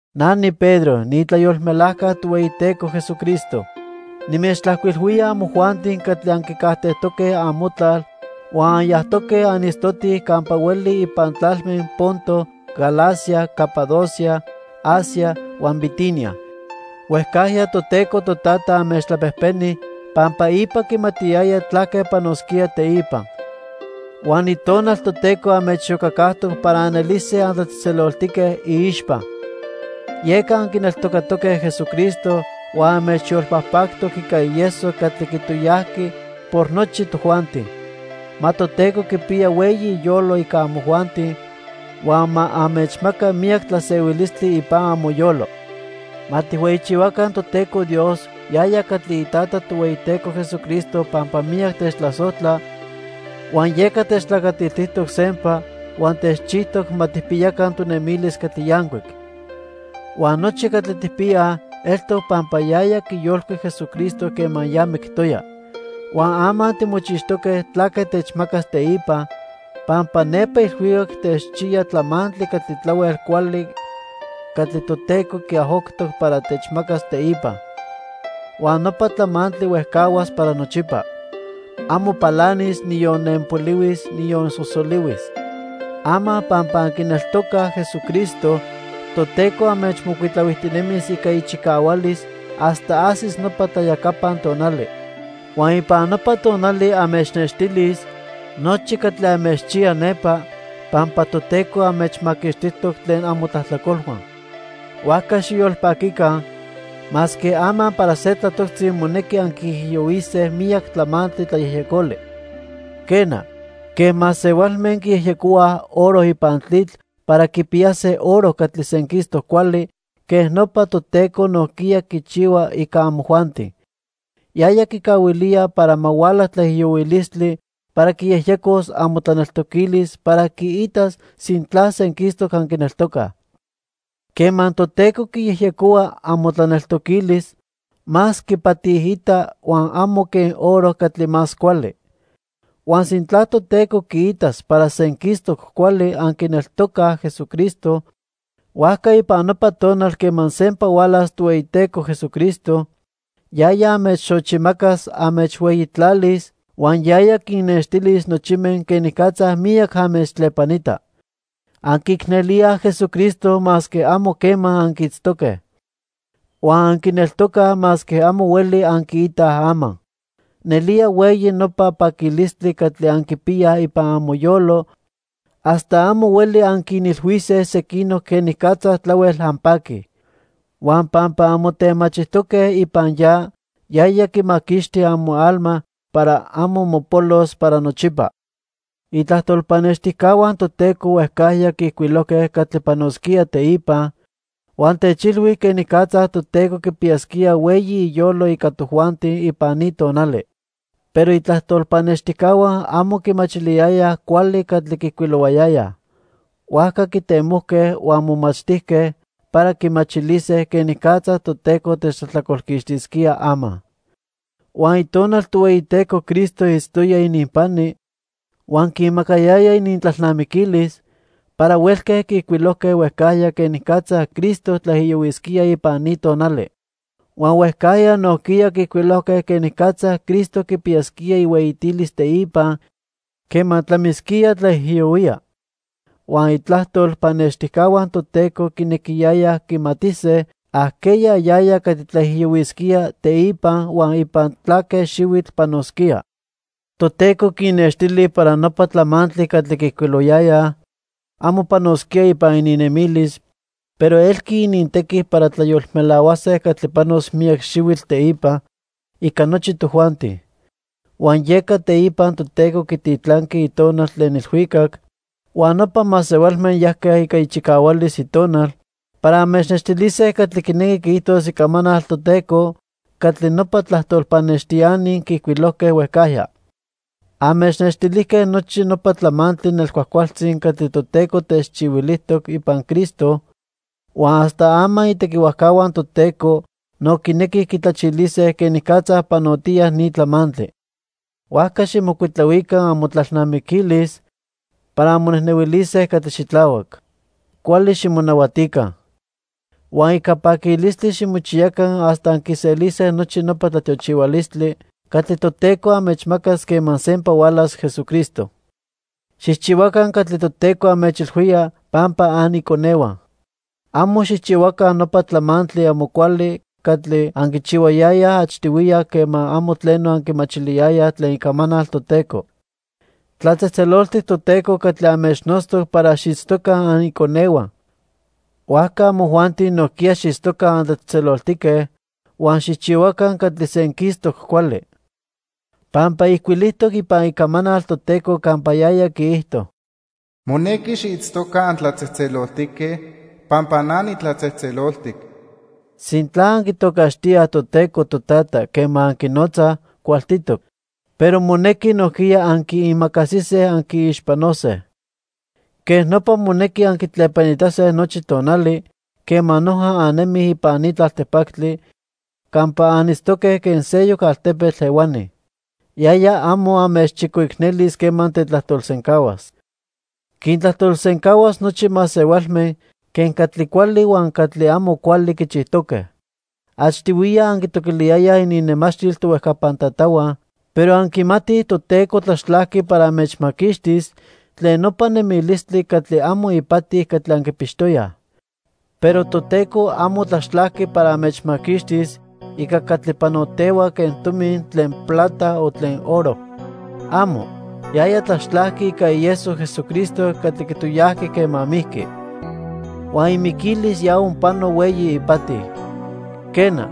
Na niPedro niitlayolmelajca Tohueyiteco Jesucristo. Nimechtlajcuilhuía amojuanti catli anquicajtejtoque amotlal huan anyajtoque anitztotij campa hueli ipan tlalme Ponto, Galacia, Capadocia, Asia huan Bitinia. Huejcajya Toteco Totata anmechtlapejpeni pampa ipa quimatiyaya tlaque panosquía teipa. Huan Itonal Toteco anmechiyocacajtoc para anelise antlatzejtzeloltique iixpa. Yeca anquineltocatoque Jesucristo huan anmechyolpajpactoc ica ieso catli quitoyajqui por nochi tojuanti. Ma Toteco quipiya hueyi iyolo ica amojuanti huan ma anmechmaca miyac tlasehuilistli ipan amoyolo. Ma tijhueyichihuaca Toteco Dios yaya catli iTata Tohueyiteco Jesucristo pampa miyac techtlasojtla, huan yeca techtlacatiltijtoc sempa huan techchijtoc ma tijpiyaca tonemilis catli yancuic. Huan nochi catli tijpiyaj eltoc pampa yaya quiyolcuic Jesucristo quema ya mictoya. Huan ama timochixtoque tlaque techmacas teipa, pampa nepa ilhuicac techchiya tlamantli catli tlahuel cuali catli Toteco quiajoctoc para techmacas teipa. Huan nopa tlamantli huejcahuas para nochipa. Amo palanis, niyon nenpolihuis, niyon sosolihuis. Ama pampa anquineltocaj Jesucristo, Toteco anmechmocuitlahuijtinemis ica ichicahualis hasta ajsis nopa tlayacapan tonali. Huan ipan nopa tonali anmechnextilis nochi catli anmechchiya nepa pampa Toteco anmechmaquixtijtoc tlen amotlajtlacolhua. Huajca xiyolpaquica, masque ama para se tlatoctzi monequi anquiijiyohuise miyac tlamantli tlayejyecoli. Quena, quen masehualme quiyejyecohuaj oro ipan tlitl para quipiyase oro catli senquistoc cuali, quej nopa Toteco nojquiya quichihua ica amojuanti. Yaya quicahuilía para ma huala tlaijiyohuilistli para quiyejyecos amotlaneltoquilis para quiitas sintla senquistoc anquineltocaj. Quema Toteco quiyejyecohua amotlaneltoquilis, más quipatiita huan amo quen oro catli más cuali. Huan sintla Toteco quiitas para senquistoc cuali anquineltocaj Jesucristo, huajca ipan nopa tonal quema sempa hualas Tohueyiteco Jesucristo yaya anmechxochimacas, anmechhueyitlalis huan yaya quinnextilis nochime quenicatza miyac anmechtlepanita. Anquiicnelíaj Jesucristo masque amo quema anquiitztoque. Huan anquineltocaj masque amo hueli anquiitaj ama. Nelía hueyi nopa paquilistli catli anquipiyaj ipan amoyolo hasta amo hueli anquinilhuise sequinoc quenicatza tlahuel anpaquij. Huan pampa anmotemachijtoque ipan ya, yaya quimaquixti amoalma para amo mopolos para nochipa. Itlajtol pannextijcahua Toteco huejcajya quiijcuilojque catli panosquía teipa huan techilhui quenicatza Toteco quipiyasquía hueyi iyolo ica tojuanti ipan ni tonali. Pero itlajtol pannextijcahua amo quimachiliyayaj cuali catli quiijcuilohuayayaj. Huajca quitemojque huan momachtijque para quimachilise quenicatza Toteco techtlajtlacolquixtisquía ama. Huan Itonal Tohueyiteco Cristo itztoya ininpani, huan quinmacayaya inintlalnamiquilis para huelque quiijcuilojque huejcajya quenicatza Cristo tlaijiyohuisquía ipan ni tonali. Huan huejcajya nojquiya quiijcuilojque quenicatza Cristo quipiyasquía ihueyitilis teipa, quema tlamisquía tlaijiyohuía. Huan itlajtol pannextijcahua Toteco quinequiyayaj quimatise ajqueya yaya catli tlaijiyohuisquía teipa huan ipan tlaque xihuitl panosquía. Toteco quinnextili para nopa tlamantli catli quiijcuilohuayayaj amo panosquía ipan ininnemilis, pero elqui inintequi para tlayolmelahuase catli panos miyac xihuitl teipa ica nochi tojuanti. Huan yeca teipa Toteco quititlanqui Itonal tlen ilhuicac, huan nopa masehualme yajque ica ichicahualis Itonal para anmechnextilise catli quinequi quiijtos Icamanal Toteco catli nopa tlajtol pannextiani quiijcuilojque huejcajya. Anmechnextilijque nochi nopa tlamantli nelcuajcualtzi catli Toteco techchihuilijtoc ipan Cristo huan hasta ama itequihuajcahua Toteco no quinequij quitlachilise quenicatza panotiya ni tlamantli. Huajca xijmocuitlahuica amotlalnamiquilis para anmonejnehuilise catli xitlahuac. Cuali ximonahuatica. Huan ica paquilistli ximochiyaca hasta anquiselise nochi nopa tlatiochihualistli catli Toteco anmechmacas quema sempa hualas Jesucristo. Xijchihuaca catli Toteco anmechilhuía pampa aniconehua. Amo xijchihuaca nopa tlamantli amo cuali catli anquichihuayayaj achtihuiya quema amo tleno anquimachiliyayaj tlen icamanal Toteco. Tlatzejtzeloltic Toteco catli anmechnotztoc para xiitztoca aniconehua; huajca amojuanti nojquiya xiitztoca antlatzejtzeloltique huan xijchihuaca catli senquistoc cuali. Pampa ijcuilijtoc ipan Icamanal Toteco campa yaya quiijto: "Monequi xiitztoca antlatzejtzeloltique pampa na nitlatzejtzeloltic." Sintla anquitocaxtíaj Toteco "Totata" quema anquinotzaj, cualtitoc, pero monequi nojquiya anquiimacasise anquiixpanose. Quej nopa monequi anquitlepanitase nochi tonali quema noja annemij ipan ni tlaltipactli campa anitztoque quen seyoc altepetl ehuani. Yaya amo anmechchicoicnelis quema tetlajtolsencahuas. Quintlajtolsencahuas nochi masehualme quen catli cuali huan catli amo cuali quichijtoque. Achtihuiya anquitoquiliyayaj ininnemachtil tohuejcapan tatahua, pero anquimatij Toteco tlaxtlajqui para anmechmaquixtis tlen nopa nemilistli catli amo ipati catli anquipixtoyaj. Pero Toteco amo tlaxtlajqui para anmechmaquixtis ica catli panotehua quen tomi tlen plata o tlen oro. ¡Amo! Yaya tlaxtlajqui ica ieso Jesucristo catli quitoyajqui quema mijqui. Huan imiquilis ya onpano hueyi ipati. Quena,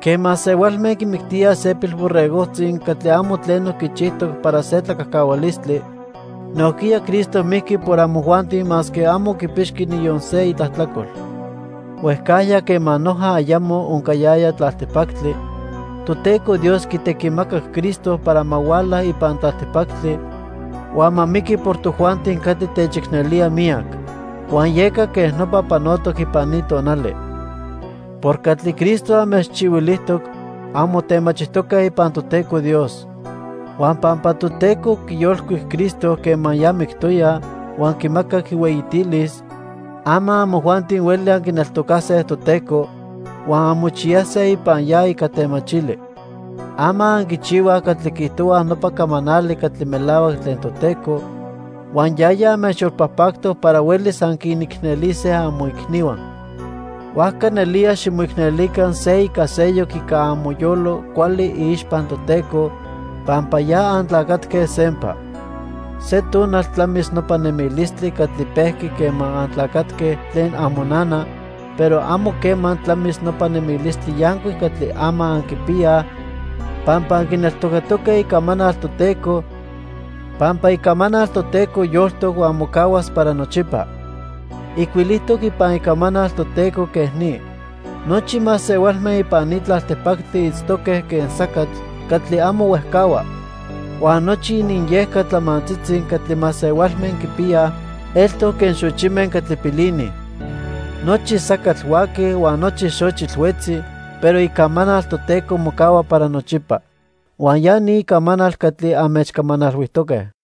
quen masehualme quimictíaj se pilborregojtzi catli amo tleno quichijtoc para se tlacajcahualistli, nojquiya Cristo mijqui por amojuanti masque amo quipixqui niyon se itlajtlacol. Huejcajya quema noja ayamo oncayaya tlaltipactli, Toteco Dios quitequimacac Cristo para ma huala ipan tlaltipactli huan ma miqui por tojuanti catli techicnelía miyac. Huan yeca quej nopa panotoc ipan ni tonali. Por catli Cristo anmechchihuilijtoc, anmotemachijtoque ipan Toteco Dios. Huan pampa Toteco quiyolcuic Cristo quema ya mictoya huan quimacac ihueyitilis, ama amojuanti hueli anquineltocase Toteco huan anmochiyase ipan ya ica temachili. Ama anquichihuaj catli quiijtohua nopa camanali catli melahuac tlen Toteco, huan yaya anmechyolpajpactoc para huelis anquinicnelise amoicnihua. Huajca nelía ximoicnelica se ica seyoc ica amoyolo cuali iixpa Toteco, pampa ya antlacatque sempa. Se tonal tlamis nopa nemilistli catli pejqui quema antlacatque tlen amonana, pero amo quema tlamis nopa nemilistli yancuic catli ama anquipiyaj pampa anquineltocatoque Icamanal Toteco, pampa Icamanal Toteco yoltoc huan mocahuas para nochipa. Ijcuilijtoc ipan Icamanal Toteco quej ni: "Nochi masehualme ipan ni tlaltipactli itztoque quen sacatl catli amo huejcahua. Huan nochi ininyejca tlamantzitzi catli masehualme quipiyaj eltoc quen xochime catli pilinij. Nochi sacatl huaqui huan nochi xochitl huetzi, pero Icamanal Toteco mocahua para nochipa." Huan ya ni Icamanal catli anmechcamanalhuijtoque.